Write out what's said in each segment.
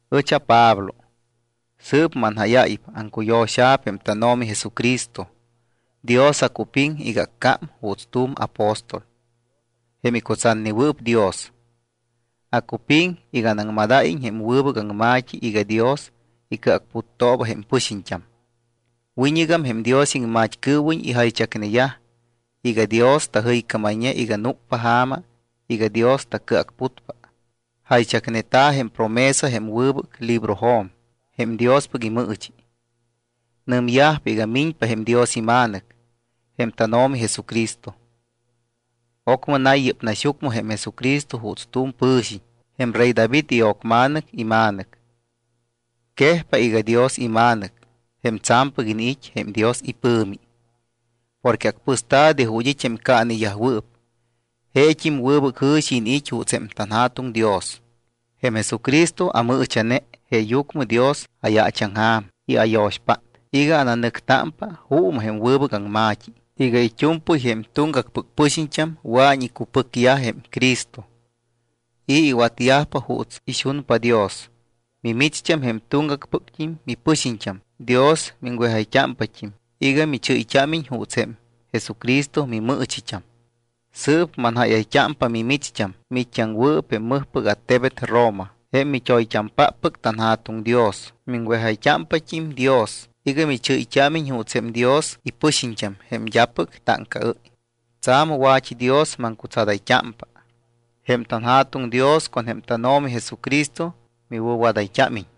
Ɨch aPablo, sɨɨp manjáyáypa. Aŋcuyo̱xa̱p jém tánO̱mi Jesucristo. Dios acupiŋ iga accám juuts tu̱m apóstol, jém icutsatnewɨɨp Dios. Acupiŋ iga anaŋmad́iñ jém wɨbɨc aŋma̱t́i iga Dios icɨacputtooba jém pɨxiñt́am. Wiñɨgam jém Dios iŋmat́cɨɨwiñ ijaychacneyaj iga Dios tajɨycámayñe iga núcpa ja̱ma iga Dios tacɨacputpa. Jaychacneta̱ jém promesa jém wɨbɨc librojo̱m jém Diospɨc imɨɨchi. Nɨmyajpa iga miñpa jém Dios iMa̱nɨc, jém tánO̱mi Jesucristo. Ocmɨ nay yɨ́p naxyucmɨ jém Jesucristo juuts tu̱m pɨ̱xiñ, jém rey David io̱cma̱nɨc ima̱nɨc. Quejpa iga Dios iMa̱nɨc, jém tsa̱mpɨc iniit́ jém Dios ipɨ̱mi, porque acpɨsta̱ de ju̱t́ it́ jém caaneyajwɨɨp. Jeet́im wɨbɨc jɨ̱xi iniit́ juuts tanJa̱tuŋ Dios. Jém Jesucristo amɨɨcha̱ne, jeeyucmɨ Dios ayaachaŋja̱m y ayo̱xpát iga ananɨctámpa juumɨ jém wɨbɨc aŋma̱t́i iga it́u̱mpɨy jém tuŋgacpɨc pɨxiñt́am wɨa̱iñ icupɨcyaj jém Cristo y iwatyajpa juuts ixunpa Dios. Mimicht́am jém tuŋgacpɨct́im mipɨxiñt́am. Dios miŋwejayt́ámpat́im iga michɨ́yt́ámiñ juuts jém Jesucristo mimɨɨchit́am. Sɨɨp manjáyayt́ámpa mimicht́am, miit́t́aŋwɨɨp jém mɨjpɨc attebet Roma, jém mit́oyt́ampáppɨc tanJa̱tuŋ Dios. Miŋwejayt́ámpat́im Dios iga michɨ́yt́ámiñ juuts jém Dios ipɨxiñt́am jém d́apɨc táŋcaɨ́y. Tsa̱m wa̱t́idios maŋcutsadayt́ámpa. Jém tanJa̱tuŋ Dios con jém tánO̱mi Jesucristo miwɨ̱wadayt́ámiñ.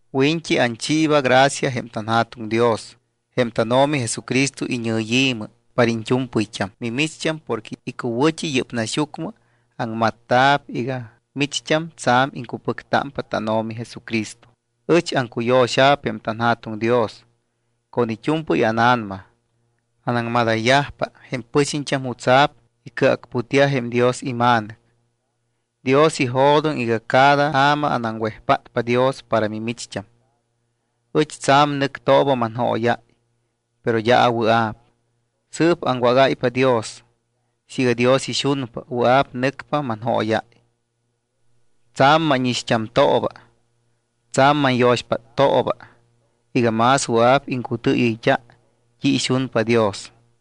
Wiñt́i anchiiba gracia jém tanJa̱tuŋ Dios jém tánO̱mi Jesucristo iñɨyi̱mɨ para iñt́u̱mpɨyt́am mimicht́am porque icuwɨ̱t́i yɨ́p naxyucmɨ aŋmatta̱p iga micht́am tsa̱m iŋcupɨctámpa tánO̱mi Jesucristo. Ɨch aŋcuyo̱xa̱p jém tanJa̱tuŋ Dios con it́u̱mpɨy ána̱nama. Anaŋmadáypa jém pɨxiñt́am jutsa̱p icɨacputyaj jém Dios iMa̱nɨc. Dios ijo̱doŋ iga cada ja̱ma anaŋwejpátpa Dios para mimicht́am. Ɨch tsa̱m nɨctooba manjóyáy, pero d́a awɨa̱p. Sɨɨp aŋwágáypa Dios, siiga Dios ixunpa, wɨa̱p nɨcpa manjóyáy. Tsa̱m mánixt́amtooba. Tsa̱m manyo̱xpáttooba iga más wɨa̱p iŋcutɨɨyɨyt́a t́i ixunpa Dios.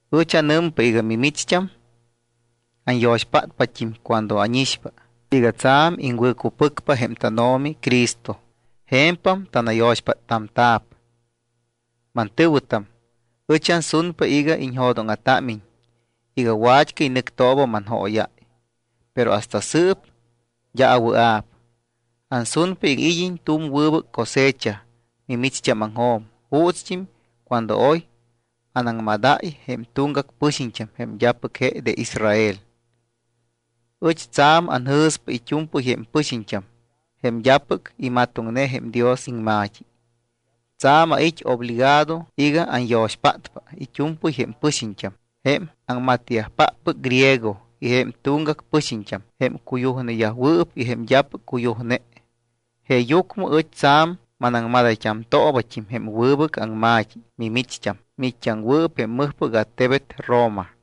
Ɨch anɨmpa iga mimicht́am anyo̱xpátpat́im cuando ánixpa iga tsa̱m iŋwɨ̱cupɨcpa jém tánO̱mi Cristo. Je̱mpam tanayo̱xpáttamta̱p. Mantɨ̱wɨtam, ɨch ansunpa iga iñjo̱dóŋa̱támiñ iga wat́cɨy nɨctooba manjóyáy, pero hasta sɨɨp d́a awɨa̱p. Ansunpa iga id́iñ tu̱m wɨbɨc cosecha mimicht́ámaŋjo̱m, juutst́im cuando oy anaŋmadáy jém tuŋgac pɨxiñt́am jém d́apɨc je de Israel. Ɨch tsa̱m anjɨ̱spa it́u̱mpɨy jém pɨxiñt́am jém d́apɨc imatoŋne jém Dios iŋma̱t́i. Tsa̱m ait́ obligado iga anyo̱xpátpa it́u̱mpɨy jém pɨxiñt́am jém aŋmatyajpáppɨc griego y jém tuŋgacpɨc pɨxiñt́am; jém cuyujneyajwɨɨp y jém d́apɨc cuyujne. Jeeyucmɨ ɨch tsa̱m manaŋmadayt́amtoobat́im jém wɨbɨc aŋma̱t́i mimicht́am, miit́t́aŋwɨɨp jém mɨjpɨc attebet Roma.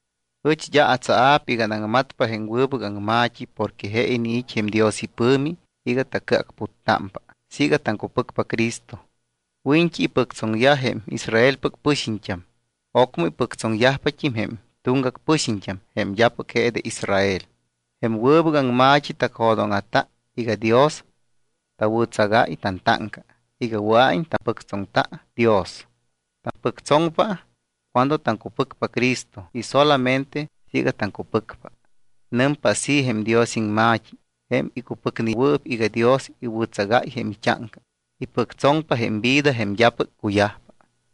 Ɨch d́a atsaa̱p iga anaŋmatpa jém wɨbɨc aŋma̱t́i porque je iniit́ jém Dios ipɨ̱mi iga tacɨacputtámpa siiga taŋcupɨcpa Cristo. Wiñt́i ipɨctsoŋyaj jém Israelpɨc pɨxiñt́am, ocmɨ ipɨctsoŋyajpat́im jém tuŋgac pɨxiñt́am, jém d́apɨc je de Israel. Jém wɨbɨc aŋma̱t́i tacjo̱dóŋa̱ta iga Dios tawɨ̱tsagáy tantáŋca iga wɨa̱iñ tapɨctsoŋta Dios. Tapɨctsoŋpa cuando taŋcupɨcpa Cristo y solamente siiga taŋcupɨcpa. Nɨmpa así jém Dios iŋma̱t́i: “Jém icupɨcnewɨɨp iga Dios iwɨ̱tsagáy jém it́áŋca, ipɨctsoŋpa jém vida jém d́apɨc cuyajpa.”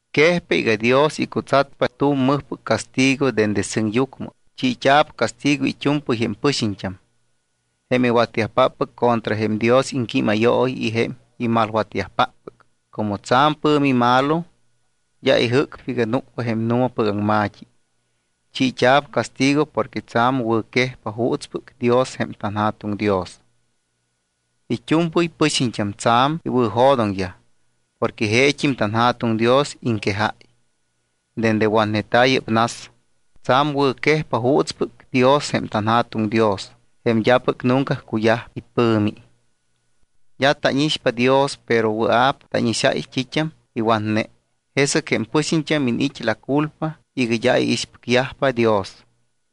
Quejpa iga Dios icutsatpa tu̱m mɨjpɨc castigo dende sɨŋyucmɨ. Chiit́a̱p castigo it́u̱mpɨy jém pɨxiñt́am, jém iwatyajpáppɨc contra jém Dios iŋquímayooyi y jém imalwatyajpáppɨc. Como tsa̱m pɨ̱mi malo, d́a ijɨ́cpa iga núcpa jém nu̱mapɨc aŋma̱t́i. Chiit́a̱p castigo porque tsa̱m wɨ̱quejpa juutspɨc Dios jém tanJa̱tuŋ Dios. It́u̱mpɨy pɨxiñt́am tsa̱m iwɨ̱jo̱doŋyaj porque jeet́im tanJa̱tuŋ Dios iŋquejáy. Dende watneta̱ yɨ́p nas, tsa̱m wɨ̱quejpa juutspɨc Dios jém tanJa̱tuŋ Dios, jém d́apɨc nunca cuyajpa ipɨ̱mi. D́a tánixpa Dios, pero wɨa̱p tánixáy t́it́am iwatne. Jesɨc jém pɨxiñt́am iniit́ la culpa iga d́a iixpɨcyajpa Dios.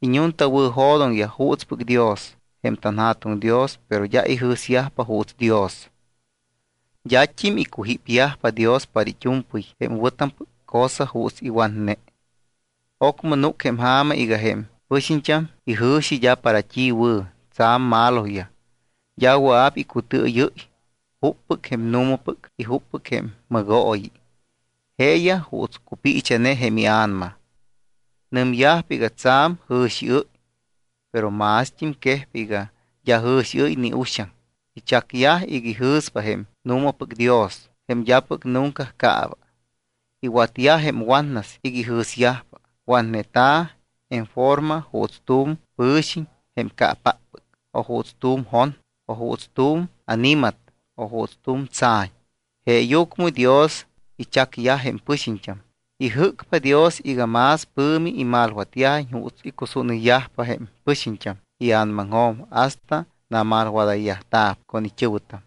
Iñuntawɨ̱jo̱doŋyaj juutspɨc Dios jém tanJa̱tuŋ Dios, pero d́a ijɨ̱syajpa juuts Dios. D́at́im icujípyajpa Dios para it́u̱mpɨy jém wɨ̱tampɨc cosa juuts iwatne. Ocmɨ núc jém ja̱ma iga jém pɨxiñt́am ijɨ̱xi d́a para t́i wɨ̱. Tsa̱m maloyaj. D́a wɨa̱p icutɨɨyɨ́y juppɨc jém nu̱mapɨc y juppɨc jém mɨgooyi. Jeeyaj juuts cupiicha̱ne jém ia̱nama. Nɨmyajpa iga tsa̱m jɨ̱xiɨ́y, pero mást́im quejpa iga d́a jɨ̱xiɨ́y ni uxaŋ. Ichacyaj iga ijɨ̱spa jém nu̱mapɨc Dios, jém d́apɨc nunca caaba. Iwatyaj jém watnas iga ijɨ̱syajpa. Watneta̱ en forma juuts tu̱m pɨ̱xiñ jém caapáppɨc, o juuts tu̱m jon, o juuts tu̱m ani̱mat, o juuts tu̱m tsa̱ñ. Jeeyucmɨ Dios ichacyaj jém pɨxiñt́am. Ijɨ́cpa Dios iga más pɨ̱mi imalwatyajiñ juuts icusúnɨyyajpa jém pɨxiñt́am ia̱namaŋjo̱m hasta namalwadayyajta̱p con it́ɨ̱wɨtam.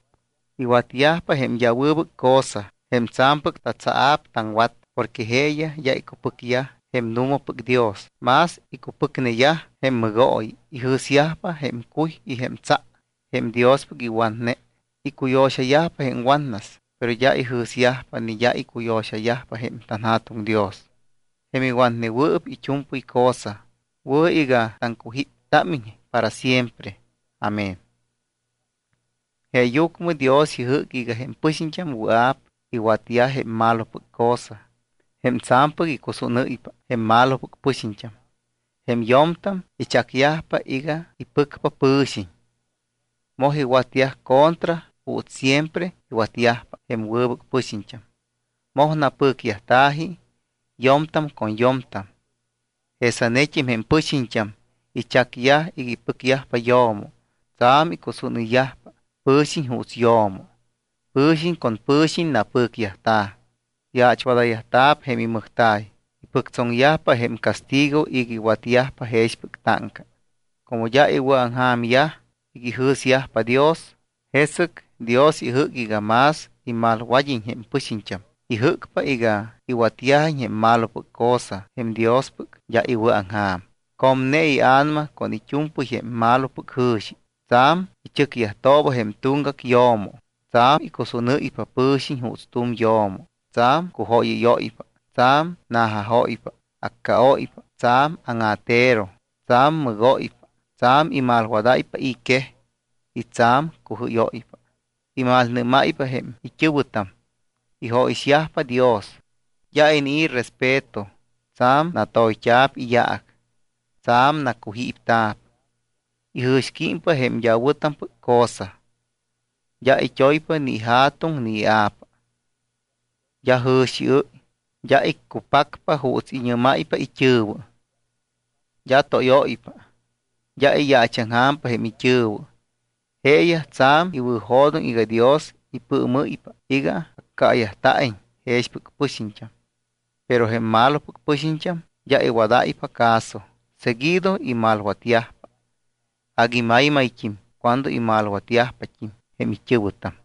Iwatyajpa jém d́a wɨbɨc cosa jém tsa̱mpɨc tatsaa̱p taŋwat, porque jeeyaj d́a icupɨcneyaj jém nu̱mapɨc Dios, más icupɨcneyaj jém mɨgooyi. Ijɨ̱syajpa jém cuy y jém tsa jém Diospɨc iwatne. Icuyo̱xayajpa jém watnas. Pero d́a ijɨ̱syajpa ni d́a icuyo̱xayajpa jém tanJa̱tuŋ Dios, jém iwatnewɨɨp it́u̱mpɨy cosa. Wɨ̱ iga taŋcujíptámiñ para siempre. Amén. Jeeyucmɨ Dios ijɨ́c iga jém pɨxiñt́am wɨa̱p iwatyaj jém malopɨc cosa, jém tsa̱mpɨc icusúnɨ́ypa jém malopɨc pɨxiñt́am. Jém yo̱mtam ichacyajpa iga ipɨcpa pɨ̱xiñ. Moj iwatyaj contra juuts siempre iwatyajpa jém wɨbɨc pɨxiñt́am. Moj napɨcyajta̱ji yo̱mtam con yo̱mtam. Jesanet́im jém pɨxiñt́am ichacyajpa iga ipɨcpa yo̱mo. Tsa̱m icusúnɨyyajpa pɨ̱xiñ juuts yo̱mo. Pɨ̱xiñ con pɨ̱xiñ napɨcyajta̱. Yaachwadayt́a̱p jém imɨjta̱y. Ipɨctsoŋyajpa jém castigo iga iwatyajpa jexpɨc táŋca. Como d́a iwɨ̱aŋja̱myaj iga ijɨ̱syajpa Dios, jesɨc Dios ijɨ́c iga más imalwad́iñ jém pɨxiñt́am. Ijɨ́cpa iga iwatyajiñ jém malopɨc cosa jém Diospɨc d́a iwɨ̱aŋja̱m. Comne ia̱nama con it́u̱mpɨy jém malopɨc jɨ̱xi. Tsa̱m ichɨcyajtooba jém tuŋgac yo̱mo. Tsa̱m icusúnɨ́ypa pɨ̱xiñ juuts tu̱m yo̱mo. Tsa̱m cujóyɨ́yóypa. Tsa̱m na̱jajóypa, accaóypa, tsa̱m áŋa̱tero, tsa̱m mɨgóypa, tsa̱m imalwadáypa i̱ quej y tsa̱m cujɨ́yóypa. Imalnɨ́máypa jém it́ɨ̱wɨtam. Ijóyixyajpa Dios. D́a inii̱ respeto. Tsa̱m natoyt́a̱p iyaac. Tsa̱m nacujípta̱p. Ijɨ̱xquímpa jém d́a wɨ̱tampɨc cosa. D́a it́oypa ni ija̱tuŋ ni ia̱pa. D́a jɨ̱xiɨ́y. D́a iccupacpa juuts iñɨ́máypa it́ɨ̱wɨ. D́a tóyóypa. D́a iyaachaŋja̱mpa jém it́ɨ̱wɨ. Jeeyaj tsa̱m iwɨ̱jo̱doŋ iga Dios ipɨɨmɨ́ypa iga accaayajta̱iñ jexpɨc pɨxiñt́am. Pero jém malopɨc pɨxiñt́am d́a iwadáypa caso. Seguido imalwatyajpa. Agui maymayt́im cuando imalwatyajpat́im jém it́ɨ̱wɨtam.